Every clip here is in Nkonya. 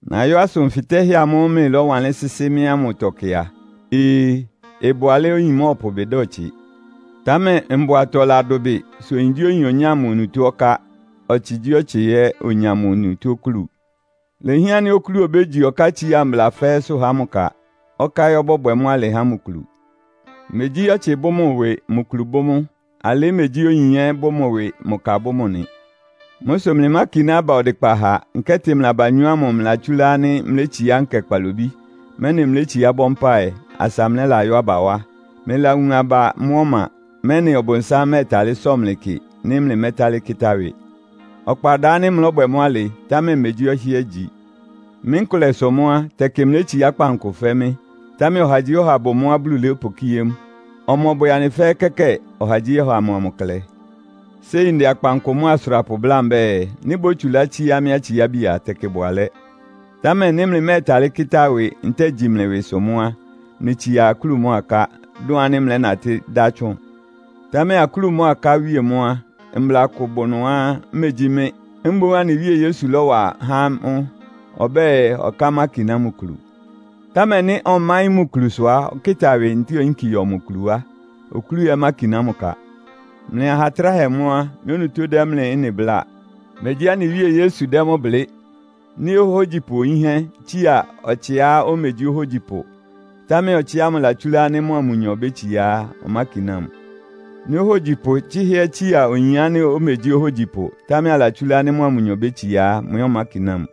Nayɔ́ asʋn fɩtɛ́hɛ́ amʋ́ʋ́ mlɩlɔ́wanlɩ́n sɩ́sɩ́ mɩ́ ámʋtɔ kɩ a, Ee! Ɩbʋ alɛ́á oyin mɔ́ɔpʋ ɩbɩ da ɔtsɩ. Támɛ mbʋatɔ ladʋbɩ sʋ oyingyíoyin onyá mʋ onutó ɔká, ɔtsɩgyíɔtsɩ ɛ́ onya mʋ onutó okúlu. Ilehián ánɩ́ okúlu obégyi ɔkátsiá mbla fɛ́ɛ́sʋ́ ha mʋ ka, ɔká ɛ́ ɔbɔ́bwɛ mʋ́ alɩ ha mʋ kulu. Megyí ɔtsɩ bʋ́ mʋ ɩwɩ, mʋ kulu bʋ́ mʋ. Alɩ́ megyí oyin ɛ́ bʋ́ mʋ ɩwɩ, mʋ ka bʋ́ mʋ nɩ. Mʋ́ sʋ mlɩmákiná aba ɔdɩkpa ha, nkɛ́tɩ mlɩ abanyɔ́ ámʋ mlɩlatsúlá ánɩ́ mlétsiá nkɛ kpalobí, mɛ́nɩ mlétsiá bɔ́ mpáɩ, asa mlɛ́layɔ́ aba wá. Mlɩlawun aba mʋ́ ɔma, mɛ́nɩ Ɔbʋnsám mɛ́ɛtalɩ́ sɔ mlɩ kɩ, nɩ́ mlɩmɛ́talɩ́ kɩ́tá ɩwɩ. Ɔkpa ɩda ánɩ́ mlɔ́bwɛ mʋ́ alɩ, támɛ megyí ɔhɩ́ɛ́ igyi. Mɩ́ nkʋlɛ sʋ mʋ́ á, tɛkɩ mlétsiá kpankʋ fɛ́ mɩ́, támɛ ɔhagyíɔha bʋ mʋ́á Bulu lɔ́pʋkíé mʋ. Ɔmɔbwɛ anɩ fɛ́ɛ́ kɛ́kɛ́ɛ. Ɔhagyíɔha mʋa mʋ klɛ. Séi ndɛ akpankʋ mʋ́a asʋrapʋ bláa mbɛ́ɛ, nɩ́ bótsulá tsíá mɩ́ atsiábi a, tɛkɩ ɩbʋ alɛ́. Támɛ nɩ́ mlɩmɛ́ɛtalɩ́ kɩ́tá ɩwɩ ntɛ́ɛ gyi mlɩ ɩwɩsʋ mʋ́ á, mlɩtsia akúlu mʋ́a aká, dʋn ánɩ́ mlɛ́natɩ́ dá tsʋn. Támɛ akúlu mʋ́a aká awíe mʋ́ á, mbla kʋ bʋ ɩnʋá megyí mɩ́, mboún anɩ Wíe Yesu lɔ́wa há amʋ́. Ɔbɛ́ɛ, ɔká mákiná mʋ kulu. Támɛ nɩ́ ɔmáɩ́n mʋ kulusʋ a, ɔkɩ́ta ɩwɩ ntɛ́ɛ oyínki yɔ mʋ kulu wá. Okúlu ɛ́ mákiná mʋ ka. Mlɩ aha tráhɛ mʋ́ á, mɩ́ onutó dɛ́ mlɩ ɩ́nɩ bláa. Megyí anɩ Wíe Yesu dɛ́ mʋ́ blɩ́. Nɩ́ ohógyipʋ yínhɛ́ tsía ɔtsɩá omegyí ohógyipʋ, támɛ ɔtsɩ ámʋ latsúlá ánɩ́ mʋa mʋnyɔ bétsiá á, ɔmákiná mʋ. Nɩ́ ohógyipʋ tsɩ́hɛ́ ɛ́ tsía oyin ánɩ́ omegyí ohógyipʋ, támɛ alatsúlá ánɩ́ mʋa mʋnyɔ bétsiá á, mʋ ɛ́ ɔmákiná mʋ.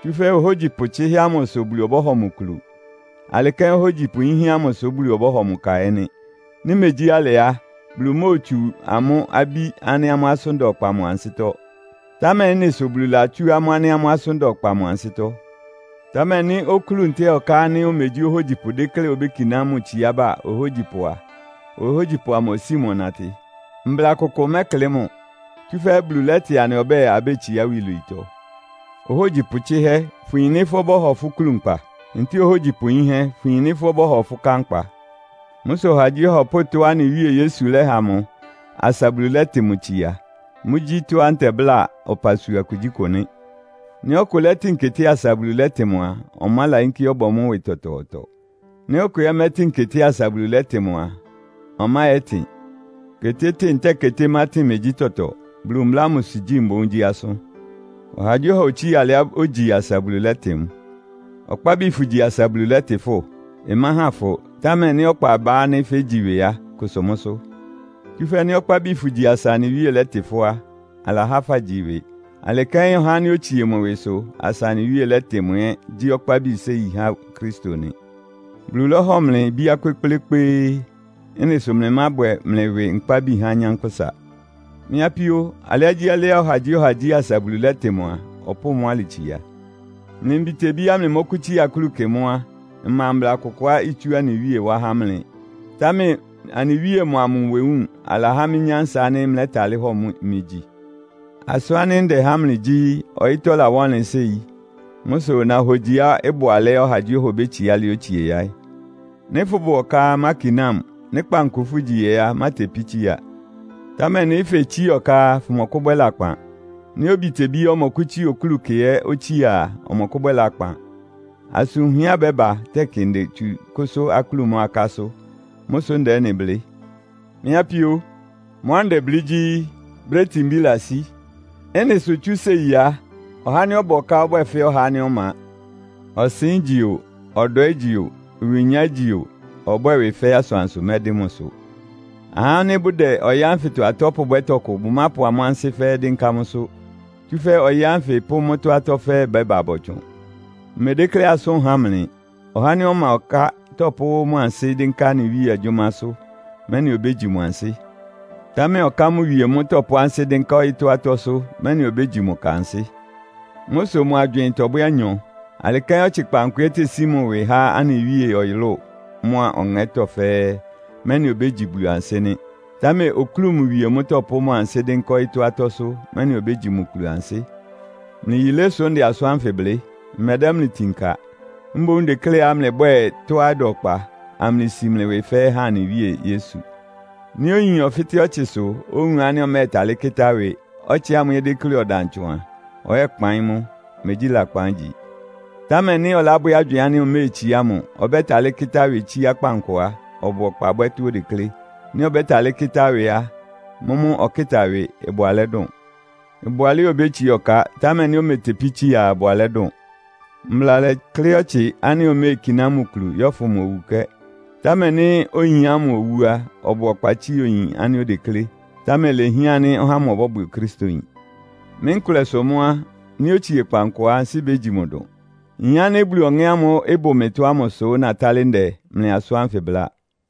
Tsúfɛ́ ohógyipʋ tsɩ́hɛ́ ámʋ sʋ Bulu ɔbɔ́hɔ mʋ kulu. Alɩ kɛ́n ohógyipʋ yínhɛ́ ámʋ sʋ Bulu ɔbɔ́hɔ mʋ ka ɛ́ nɩ́. Nɩ́ megyí alɩ á, Bulu móotsu amʋ́ abí ánɩ́ amʋ́ asʋ́n da ɔkpa mʋ ansɩ́tɔ́, támɛ ɩ́nɩ sʋ Bulu latsú amʋ́ ánɩ́ amʋ́ asʋ́n da ɔkpa mʋ ansɩ́tɔ́. Támɛ nɩ́ okúlu ntɛ́ɛ ɔká ánɩ́ omegyí ohógyipʋ dékléá obékiná mʋ tsiába ohógyipʋ a, ohógyipʋ amʋ osíi mʋ ɔnatɩ. Mbla kʋkʋ mɛklɩ́ mʋ, tsúfɛ́ Bulu lɛ́tɩ anɩ ɔbɛ́ɛ, abétsiá iwilwiitɔ. Ohógyipʋ tsɩ́hɛ́, fʋyin nɩ́ fʋ́ ɔbɔ́hɔ fʋ́ kúlu nkpa? Ntɛ́ɛ ohógyipʋ yínhɛ́, fʋyin nɩ́ fʋ́ ɔbɔ́hɔ fʋ́ ká nkpa? Mʋ́ sʋ ɔhagyíɔha ɔpʋ́ʋ tɔ́á anɩ Wíe Yesu lɛ́ha mʋ asa Bulu lɛ́tɩ mʋ tsia. Mʋ́gyí tɔ́á ntɛbláa ɔpasua kugyíkʋ nɩ́. Nɩ́ ɔkʋ lɛ́tɩn keté asa Bulu lɛ́tɩ mʋ a, ɔmálayínkí yɛ́bwɛ mʋ́ ɩwɩ tɔtɔɔtɔ. Nɩ́ ɔkʋ ɛ́ mɛ́tɩn keté asa Bulu lɛ́tɩ mʋ ɛ́ á, ɔmáyɛ́tɩn. Ketétɩ́ɩn ntɛ́ɛ ketémátɩn megyí tɔtɔ. Bulu mbla ámʋsʋ gyí mboún gyí asʋ́n. Ɔhagyíɔha otsía alɩá ogyi asa Bulu lɛ́tɩ mʋ. Ɔkpábi fʋgyi asa Bulu lɛ́tɩ fʋ́? Ɩmáhan fʋ. Támɛ nɩ́ ɔkpa ɩbá ánɩ́ fégyi ɩwɩ á, kʋsʋ mʋ́sʋ́. Tsúfɛ́ nɩ́ ɔkpábi fʋgyi asa anɩ Wíe lɛ́tɩ fʋ́ á, alahá fagyi ɩwɩ. Alɩ kɛ́n ɔhá ánɩ́ otsie mʋ ɩwɩsʋ asa anɩ Wíe lɛ́tɩ mʋ ɛ́ gyí ɔkpábi séi há Kristo nɩ. Bulu lɔ́hɔ mlɩ ibíá kpékplékpéé. Ɩ́nɩ sʋ mlɩmábwɛ mlɩ ɩwɩ nkpábi há anyánkpʋ́sa. Mɩ́ apíó, alɩágyíalɩ́á ɔhagyíɔha gyí asa Bulu lɛ́tɩ mʋ a, ɔpʋ́ʋ mʋ́ alɩ tsia. Mlɩ mbitebíá mlɩmɔ́kʋ́tsía akúlu kɩ mʋ́ á, mma mbla kʋkʋá itsú anɩ Wíe wá há mlɩ. Támɛ anɩ Wíe mʋa mʋ nwewúun, alahá mɩ́ nyánsa ánɩ́ mlɛ́talɩ́ hɔ mɩ gyi. Asʋ́n ánɩ́ ndɛ há mlɩ gyí, ɔyɩ́tɔ́ lawá ɔnlɩn séi. Mʋ́ sʋ nahogyiá ɩbʋ alɛ́á ɔhagyíɔha obétsiá alɩá otsie yaɩ́. Nɩ́ fʋ́bʋ ɔká á, mákiná mʋ. Nɩ́ kpankʋ fʋ́gyi ɛ́ á, mátepí tsía. Támɛ nɩ́ fetsiá ɔká á, fʋmɔkʋ́bwɛ́ lakpan. Nɩ́ obitebíá ɔmɔkʋ́tsía okúlu kɩ ɛ́ otsía a, ɔmɔkʋ́bwɛ́ lakpan. Asʋn wunhɛá ɩbɛ́ba tɛkɩ ndetsu kʋ́sʋ́ akúlu mʋ́a akásʋ́. Mʋ́ sʋ ndɛ ɩ́nɩ blɩ́. Mɩ́ apíó, mʋ́á ndɛblɩ́ gyí, brɛ́ itinbí ɩlasí. Ɩ́nɩ sʋ tsú séi á, ɔhá ánɩ́ ɔbʋ ɔká ɔbwɛ́ɛ fɛ́ ɔhá ánɩ́ ɔma. Ɔsɩn ígyi o, ɔdwɛ ígyi o, ɩwɩnya ígyi o, ɔbwɛ́ɛ ɩwɩ fɛ́ asʋansʋ mɛdɩ́n mʋsʋ. Ahá ánɩ́ bʋdɛ ɔyɩ́ ánfɩtɔ atɔ́ pʋbwɛ́ tɔkʋ bʋmápʋ amʋ́ ansɩ́ fɛ́ɛ́ dɩ́nká mʋ́sʋ́. Tsúfɛ́ ɔyɩ́ ánfɩ pʋ́ mʋ́tɔ́ atɔ́ fɛ́ɛ́ bɛ́ba bɔtsʋn. Mmedékléá asʋ́n ɩháan mlɩ. Ɔhá ánɩ́ ɔma ɔká tɔpʋ́ mʋ ansɩ́ dɩ́nká anɩ Wíe agyʋ́másʋ́, mɛ́nɩ obégyi mʋ ansɩ́. Támɛ ɔká mʋ wie mʋ́ tɔpʋ́ ansɩ́ dɩ́nká ɔyɩ́tɔ́ atɔ́sʋ́, mɛ́nɩ obégyi mʋ ka ansɩ́. Mʋ́ sʋ mʋ agywɩɩn tɔbwɛ́ anyɔ. Alɩ kɛ́n ɔtsɩ kpankʋ ɛ́ tesí mʋ ɩwɩ há anɩ Wíe, ɔyʋlʋ́ʋ mʋ́a ɔŋɛ́tɔ́ fɛ́ɛ́, mɛ́nɩ obégyi Bulu ansɩ́ nɩ́. Támɛ okúlu mʋ wie mʋ́ tɔpʋ́ mʋ ansɩ́ dɩ́nká ɔyɩ́tɔ́ atɔ́sʋ́, mɛ́nɩ obégyi mʋ kulu ansɩ́. Mlɩ yilé sʋ ndɛ asʋ́n ánfɩ blɩ́. Mmɛdɛ́ mlɩ itin ka. Mboún ndekléá mlɩbwɛ́ɛ tɔ́á ɩda ɔkpa, amlɩsi mlɩ ɩwɩ fɛ́ɛ́ há anɩ Wíe Yesu. Nɩ́ oyin ɔfɩ́tɛ́ ɔtsɩsʋ, owun ánɩ́ ɔmɛ́ɛtalɩ́ kɩ́tá ɩwɩ, ɔtsɩ ámʋ ɛ́ déklé ɔdan tsʋn a, ɔyɛ́kpaɩ́n mʋ. Megyí lakpan igyi. Támɛ nɩ́ ɔlábwɛ́ agywɩɩn ánɩ́ oméetsiá mʋ, ɔbɛ́talɩ́ kɩ́tá ɩwɩ tsíá kpankʋ á, ɔbʋ ɔkpa bwɛ́ tɔ́á odeklé. Nɩ́ ɔbɛ́talɩ́ kɩ́tá ɩwɩ á, mʋ́mʋ́ ɔkɩ́ta ɩwɩ. Ɩbʋ alɛ́ dʋn. Ɩbʋ alɛ́á obétsiá ɔká, támɛ nɩ́ ometepí tsía a, ɩbʋ alɛ́ dʋn. Mbla lɛ́klɩ́ ɔtsɩ ánɩ́ oméekiná mʋ kulu yɔ́fʋn mʋ owukɛ́. Támɛ nɩ́ oyin ámʋ owú á, ɔbʋ ɔkpa tsía oyin ánɩ́ odeklé. Támɛ ilehián ánɩ́ ɔhá ámʋ ɔbɔ́bwɛ Okristoyin. Mɩ́ nkʋlɛ sʋ mʋ́ á, nɩ́ otsie kpankʋ á, ansɩ́ bégyi mʋ dʋn. Nyin ánɩ́ Bulu Ɔŋɛ́ ámʋ́ʋ́ ɩbʋ mɩtɔ ámʋ sʋ́ natálɩ́ ndɛ mlɩ asʋ́n ánfɩ bláa.